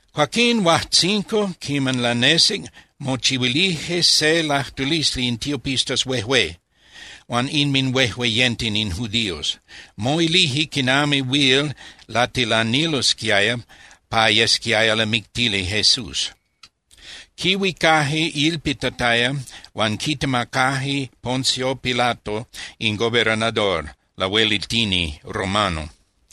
Cuaquín huajtzinco quiman lanesic mochihuilije se lajtulisli in tiopistas huejué huan inminhuejueyenten in judíos. Moilije quinami huil latilanilosquiaya pa yesquiaya lamictili Jesús. Quihuicaje ilpitataya huan quitemacaje Poncio Pilato in gobernador (lahuelitini) romano.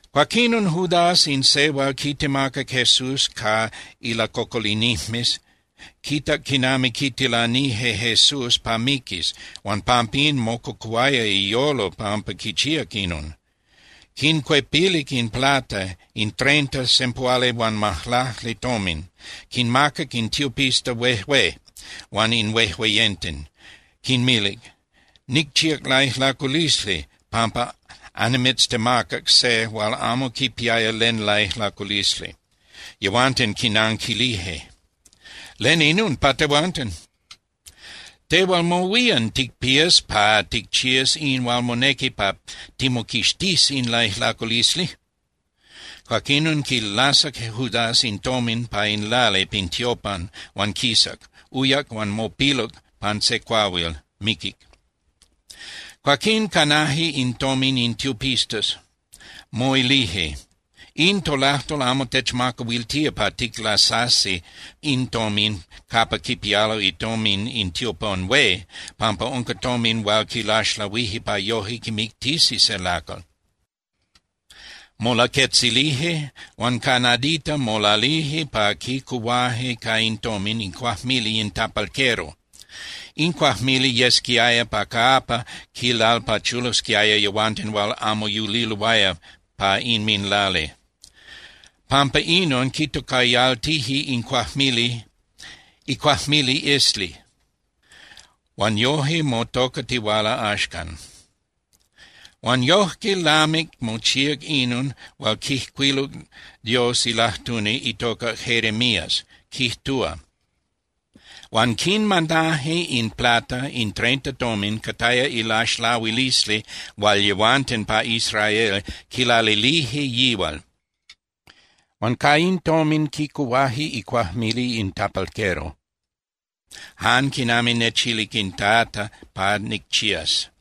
Cuaquinon Judas in se hual quitemacac Jesús ca ilacocolinijmes quitac quinami quitilanije Jesús pa miquis, huan pampín mococuhuaya iyolo pampa quichíac inon. Quincuepilic in plata, in treinta (sempuhualihuanmajlacli) tomin, quinmacac in tiopistas huejué huan in huejueyenten. Quinmilic: —Nicchíac laijlaculisli pampa annimitztemacac se hual amo quipiaya len laijlaculisli. Yehuanten quinanquilije: —¿Len inon pa tehuanten? Tehual mohuían ticpías pa ticchías in hual monequi pa timoquixtís in laijlaculisli. Cuaquinon quilasac Judás in tomin pa in lali pin tiopan huan quisac, uyac, huan mopiluc pan se cuahuil, miquic. Cuaquín canaje in tomin in tiopistas, moilije: —In tolajtol amo techmacahuiltía pa ticlasasi in tomin capa quipialo itomin in tiopan hué pampa unca tomin hual quilaxlahuije pa yojque quimictisi se lacal. Molaquetzilije, huan ca nadita molalije pa quicuhuaje ca in tomin icuajmili in tapalquero. In cuajmili yesquiaya pa capa quilalpachulosquiaya yehuanten hual amo yuliloaya pa inminlali. Pampa inon quitocayaltije in cuajmili iCuajmili Esli, huan yoje motocatihuala axcan. Huan yojque lamic mochíac inon hual quijcuiluc Dios ilajtuni itocac Jeremías, quijtúa: “Huan quinmanaje in plata, in treinta tomin (cataya ilaxlahuilisli hual yehuanten pa Israel quilalilije yihual). Huan ca in tomin quicuhuaje icuajmili in tapalquero, jan quinami nechilic in Tata pa nicchías.”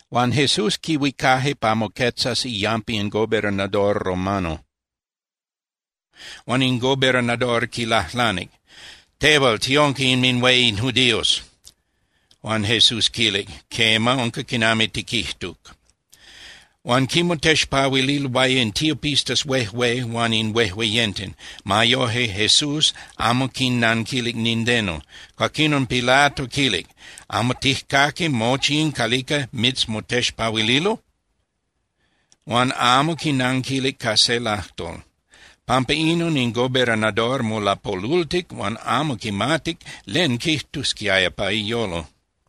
Huan Jesús quihuicaje pa moquetzas iyampa in gobernador romano, huan in gobernador quilajlanic: —Tehual, ¿tiunca inminhué in judíos? Huan Jesús quilic: —Quema, unca quinami tiquijtuc. Huan quimotexpahuililoaya in tiopistas huejué huan in huejueyenten. Ma yoje, Jesús amo quinnanquilic nindeno. Cuaquinon Pilato quilic: —¿Amo tijcaqui mochi in calica mitzmotexpahuililo? Huan amo quinanquilic ca se lajtol. Pampa inon in gobernador molapolultic huan amo quimatic len quijtusquiaya pa iyolo.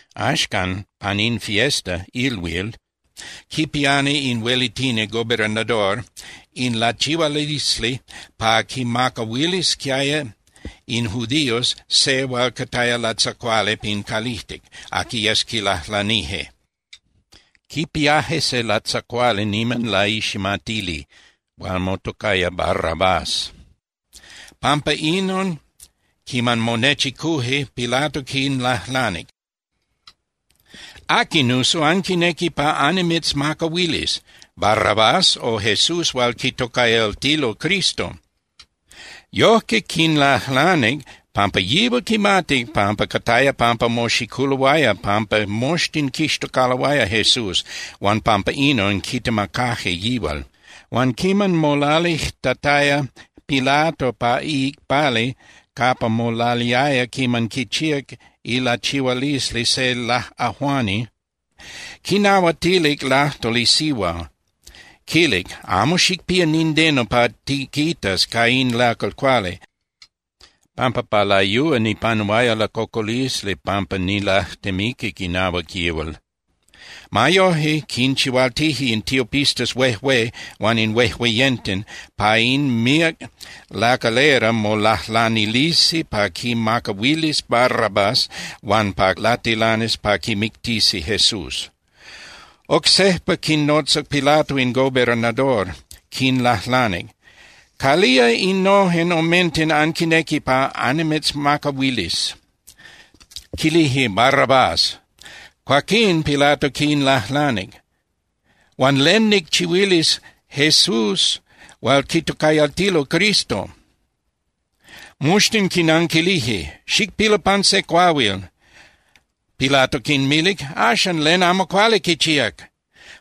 Axcan, pan in fiesta (ilhuil) quipiani in huelitini (gobernador) in lachihualisli pa quinmacahuilisquiaya in judíos se hual cataya latzacuali pin calijtic, aqui yes quilajlanije. Quipiaje se latzacuali niman laiximatili hual motocaya Barrabás. Pampa inon quiman monechicuje, Pilato quinlajlanic: —¿Aqui, nuso, anquinequi pa annimitzmacahuilis: Barrabás, o Jesús hual quitocayaltilo Cristo? Yojque quinlajlanic, pampa yihual quimatic pampa cataya pampa moxiculoaya pampa moxtin quixtocaloaya Jesús huan pampa inon quitemacaje yihual. Huan quiman molalijtataya Pilato pa iicpali capa molaliaya quiman quichíac ilachihualisli se laꞌajuani, quinahuatilic lajtol isihua, quilic: “Amo xicpía nindeno pa tiquitas ca in lacal cuali, pampa pa layúa nipanuaya lacocolisli pampa nilajtemiquic inahuac yihual.” Ma yoje, quinchihualtije in tiopistas huejué huan in huejueyenten pa in míac lacalera molajlanilisi pa quinmacahuilis Barrabás huan pa latilanis pa quimictisi Jesús. Oc sejpa quinnotzac Pilato in gobernador, quinlajlanic: —¿Calía innojen omenten anquinequi pa annimitzmacahuilis? Quilije: —Barrabás. Cuaquín Pilato quinlajlanic: —Huan ¿len nicchihuilis Jesús hual quitocayaltilo Cristo? Moxtin quinanquilije: —¡Xicpilu pan se cuahuil! Pilato quinmilic: —Axan, ¿len amo cuali quichíac?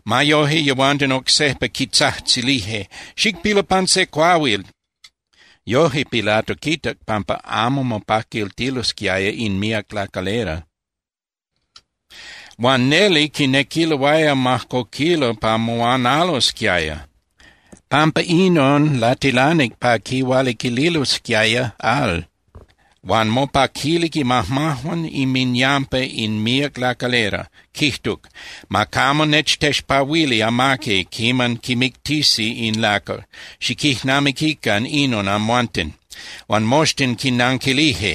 Ma yoje, yehuanten oc sejpa quitzajtzilije: —¡Xicpilu pan se cuahuil! Yoje Pilato quitac pampa amo mopaquiltilosquiaya in míac lacalera, huan neli quinequiloaya majcoquilo pa moanalosquiaya. Pampa inon latilanic pa quihualiquililosquiaya al huan mopaquilic imajmajuan inminyampa in míac lacalera, quijtuc: —Ma camo nechtexpahuili amaqui quiman quimictisi in lacal. Xiquijnamiquican inon amhuanten. Huan moxtin quinanquilije: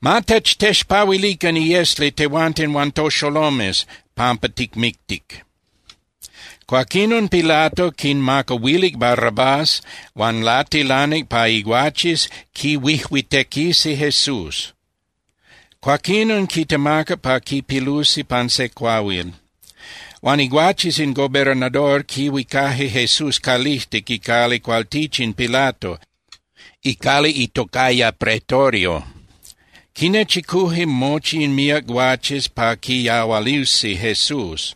—¡Ma techtexpahuilican iesli tehuanten huan toxolomes pampa ticmictic! Cuaquinon Pilato quinmacahuilic Barrabás, huan latilanic pa iguaches quihuijuitequisi Jesús. Cuaquinon quitemacac pa quipilusi pan se cuahuil. Huan iguaches in gobernador quihuicaje Jesús calijtic icali cualtichin Pilato, icali itocaya Pretorio. Quinnechicuje mochi in míac guaches pa quiyahualusi Jesús.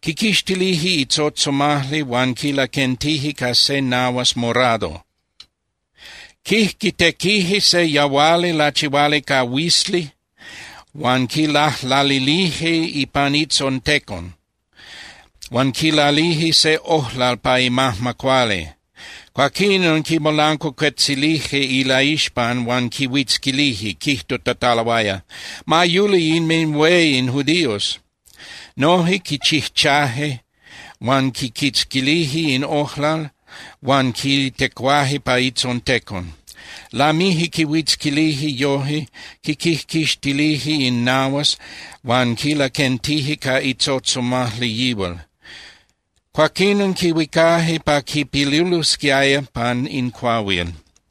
Quiquixtilije itzotzomajli huan quilaquentije ca se nahuas morado. Quijquitequije se yahuali lachihuali ca huizli huan quilajlalilije ipan itzontecon, huan quilalije se ojlal pa imajma cuali. Cuaquinon quimolancuacuetzilije ilaixpan huan quihuitzquilije quijtutataloaya: —¡Ma yuli inminhué in judíos! Noje quichijchaje, huan quiquitzquilije in ojlal huan quitecuaje pa itzontecon. Lamije quihuitzquilije yoje, quiquijquixtilije in nahuas huan quilaquentije ca itzotzomajli yihual, cuaquinon quihuicaje pa quipilulosquiaya pan in cuahuil.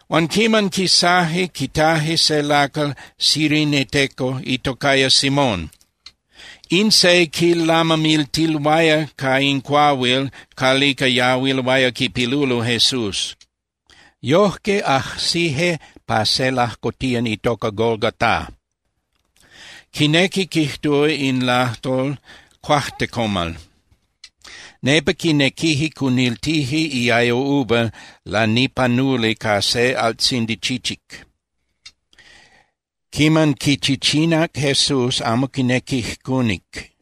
Huan quiman quisaje, quitaje se lacal cireneteco itocaya Simón. In se quilamamiltiloaya ca in cuahuil calica yahuiloaya quipilulo Jesús. Yojque ajsije pa se lajcotiyan itoca Golgotá. Quinequi quijtúa in lajtol “Cuajtecomal”. Nepa quinequije cuniltije iayo uva lanipanuli ca se altzindi chichic. Quiman quichichinac Jesús amo quinequic cunic.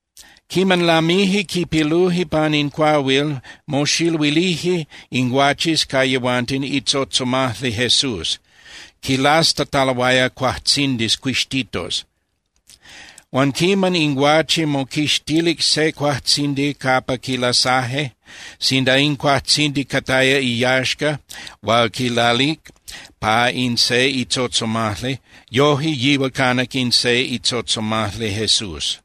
Quiman lamije quipiluje pan in cuahuil, moxiluilije in guaches ca yehuanten itzotzomajli Jesús, quilastataloaya cuajtzindis cuixtitos. Huan quiman in guache moquixtilic se cuajtzindi capa quilasaje, sinda in cuajtzindi cataya iyaxca hual quilalic pa in se itzotzomajli, yoje yihual canac in se itzotzomajli Jesús.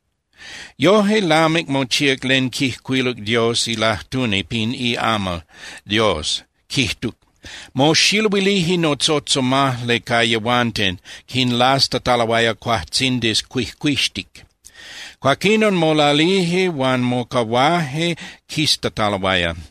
Yojque lamic mochíac len quijcuiluc Dios ilajtuni pin iamal Dios, quijtuc: “Moxiluilije notzotzomajli ca yehuanten quinlastataloaya cuajtzindis cuijcuixtic.” Cuaquinon molalije huan mocahuaje quiztataloaya.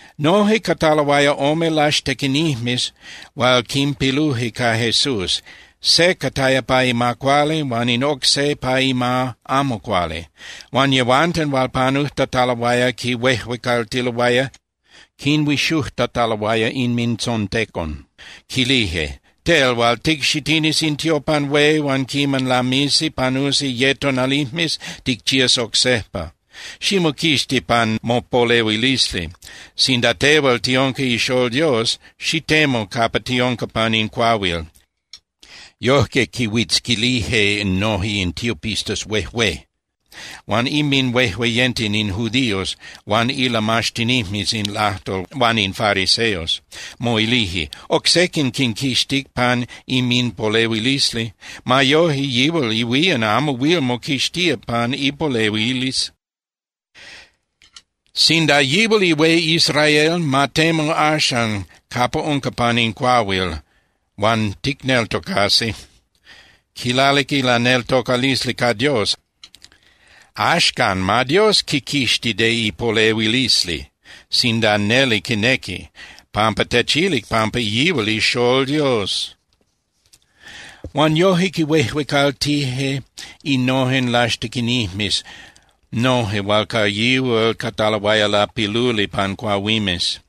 Noje cataloaya ome laxtequinijmes hual quinpiluje ca Jesús, se cataya pa ima cuali huan in oc se pa ima amo cuali. Huan yehuanten hual panujtataloaya quihuejuecaltiloaya, quinhuixujtataloaya inmintzontecon. Quilije: —Tel hual ticxitinis in tiopan hué huan quiman lamisi panusi ye tonalijmes ticchías oc sejpa, ximoquixti pan mopolehuilisli. Sinda tehual tiunca ixól Dios, xitemu capa tiunca pan in cuahuil. Yojque quihuitzquilije noje in tiopistas huejué huan inminhuejueyenten in judíos huan ilamaxtinijmes in lajtol huan in fariseos, moilije: —Oc sequin quinquixtic pan inminpolehuilisli. Ma yoje, yihual ihuían amo huil moquixtía pan ipolehuilisli. Sinda yihual ihué Israel, ma temu axan capa unca pan in cuahuil huan ticneltocasi. Quilalic ilaneltocalisli ca Dios. Axcan, ma Dios quiquixti de ipolehuilisli sinda neli quinequi, pampa techilic pampa yihual ixól Dios. Huan yojque quihuejuecaltije innojen laxtequinijmes noje hual ca yihual cataloaya lapiluli pan cuahuimes.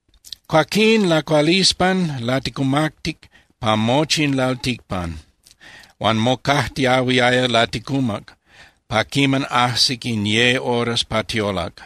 Cuaquín lacualispan laticumactic pa mochi in lalticpan, huan mocajtiahuiaya laticumac pa quiman ajsic in ye horas pa tiolac.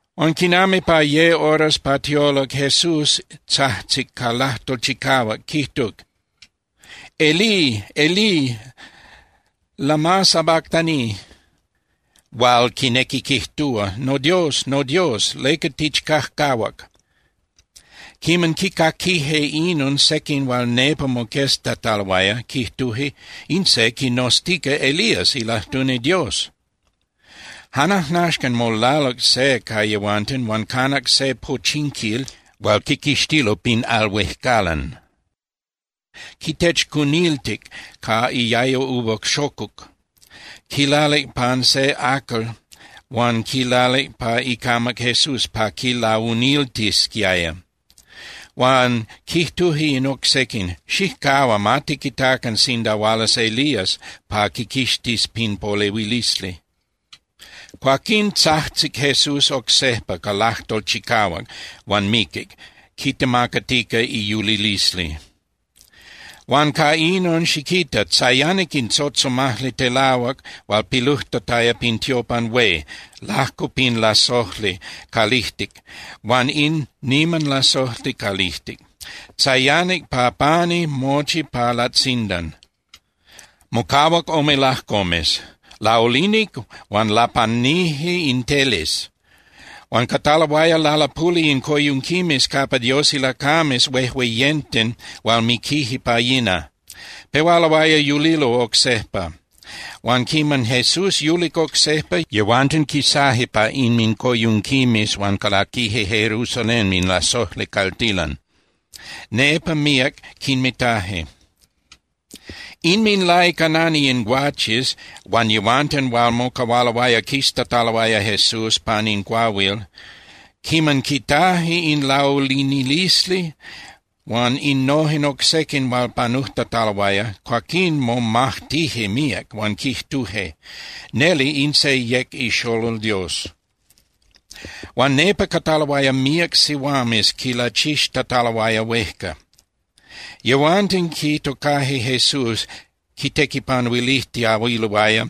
Huan quinami pa ye horas pa tiolac Jesús tzajtzic ca lajtol chicahuac, quijtuc: —¡Elí, Elí! ¿Lama sabactani? —hual quinequi quijtúa: ¡NoDios, noDios! ¿Leca tichcajcahuac? Quiman quicaquije inon sequin hual nepa moqueztataloaya, quijtuje: —In se quinoztica Elías ilajtuni Dios. Jan ajnaxcan molaluc se ca yehuanten huan canac se pochinquil hual quiquixtilo pin al huejcalan, quitechcuniltic ca iayo uva xocuc, quilalic pan se acal huan quilalic pa icamac Jesús pa quilauniltisquiaya. Huan quijtuje in oc sequin: —Xijcahua, ma tiquitacan sinda hualas Elías pa quiquixtis pin polehuilisli. Cuaquín tzajtzic Jesús oc sejpa ca lajtol chicahuac, huan miquic, quitemacatica iyulilisli. Huan ca inon, xiquita, tzayanic in tzotzomajli telahuac hual pilujtataya pin tiopan hué lajco pin lasojli calijtic huan in niman lasojli calijtic. Tzayanic pa pani mochi pa latzindan, mocahuac ome lajcomes. Laulinic huan lapanije in teles. Huan cataloaya lalapuli in coyunquimes capa Dios ilacames huejueyenten hual miquije pa yina. Pehualoaya yulilo oc sejpa. Huan quiman Jesús yulic oc sejpa, yehuanten quisaje pa inmincoyunquimes huan calaquije Jerusalén in lasojli caltilan. Nepa míac quinmitaje. Inminlaicanani in guaches huan yehuanten hual mocahualoaya quiztataloaya Jesús pan in cuahuil, quiman quitaje in laulinilisli huan innojen oc sequin hual panujtataloaya, cuaquín momajtije míac, huan quijtuje: —Neli in se yec ixolol Dios. Huan nepa cataloaya míac sihuames quilachixtataloaya huejca. Yehuanten quitocaje Jesús quitequipanuilijtiahuiloaya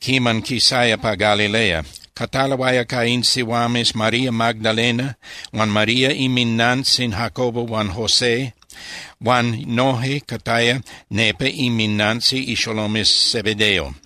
quiman quisaya pa Galilea. Cataloaya ca in sihuames María Magdalena huan María inminantzin Jacobo huan José, huan noje cataya nepa inminantzin ixolomes Zebedeo.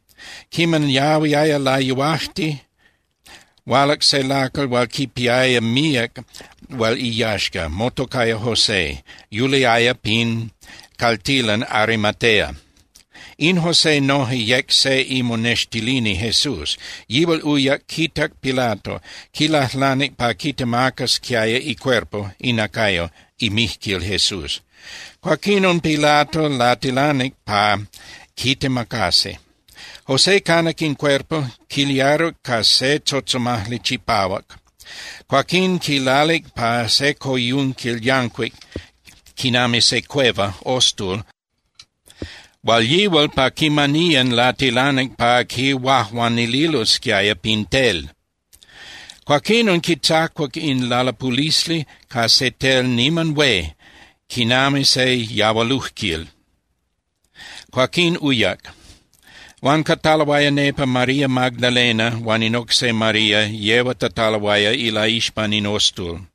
Quiman yahuiaya layuajti, hualac se lacal hual quipiaya míac hual iyaxca, motocaya José, yuliaya pin caltilan Arimatea. In José noje yec se imonextilini Jesús. Yihual uyac quitac Pilato, quilajlanic pa quitemacasquiaya icuerpo (inacayo) imijquil Jesús. Cuaquinon Pilato latilanic pa quitemacasi. José canac in cuerpo, quiliaruc ca se tzotzomajli chipahuac. Cuaquín quilalic pa se coyunquil yancuic quinami se cueva (ostul) hual yihual pa quimaniyan latilanic pa quihuajuanililosquiaya pin tel. Cuaquinon quitzacuac in lalapulisli ca se tel niman hué quinami se yahualujquil, cuaquín uyac. Huan cataloaya nepa María Magdalena huan in oc se María yehuatataloaya ilaixpan in ostul.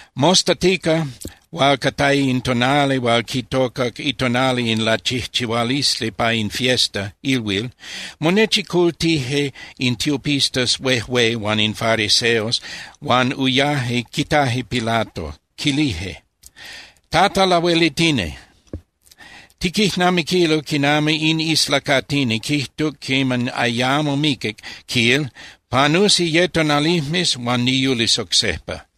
Mostatica hual cataya in tonali hual quitocac itonali in lachijchihualisli pa in fiesta (ilhuil), monechicultije in tiopistas huejué huan in fariseos huan uyaje quitaje Pilato. Quilije: —Tata Lahuelitini, tiquijnamiquilo quinami in islacatini quijtuc quiman ayamo miquic, quil, “Panusi ye tonalijmes, huan niyulis oc sejpa.”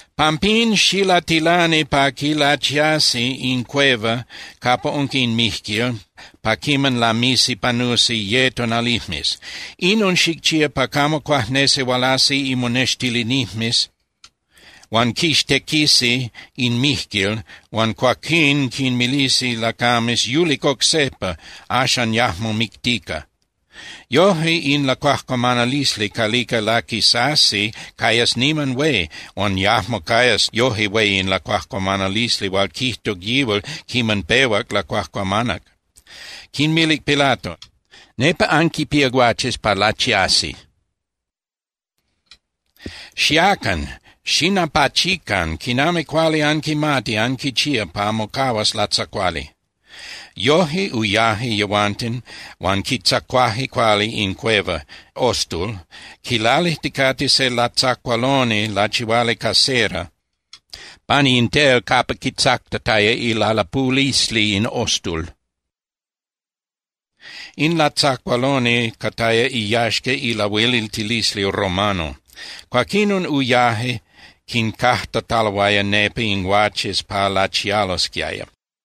Pampín, xilatilani pa quilachiasi in cueva capa unca in mijquil pa quiman lamisi panusi ye tonalijmes. Inon xicchía pa camo cuajnesi hualasi imonextilinijmes huan quixtequisi in mijquil huan cuaquín quinmilisi lacames: “Yulic oc sejpa, axan yajmo mictica.” Yojque, in lacuajcuamanalisli calica laquisasi cayas niman hué, huan yajmo cayas yoje hué in lacuajcuamanalisli hual quijtuc yihual quiman pehuac lacuajcuamanac. Quinmilic Pilato: —Nepa anquipía guaches pa lachiasi. Xiacan, xinapachican quinami cuali anquimati anquichía pa mocahuas latzacuali. Yoje uyaje yehuanten huan quitzacuaje cuali in cueva (ostul) quilalijticate se latzacualoni lachihuali ca cera pani in tel capa quitzactataya ilalapulisli in ostul. In latzacualoni cataya iyaxca ilahueliltilisli romano. Cuaquinon uyaje quincajtataloaya nepa in guaches pa lachialosquiaya.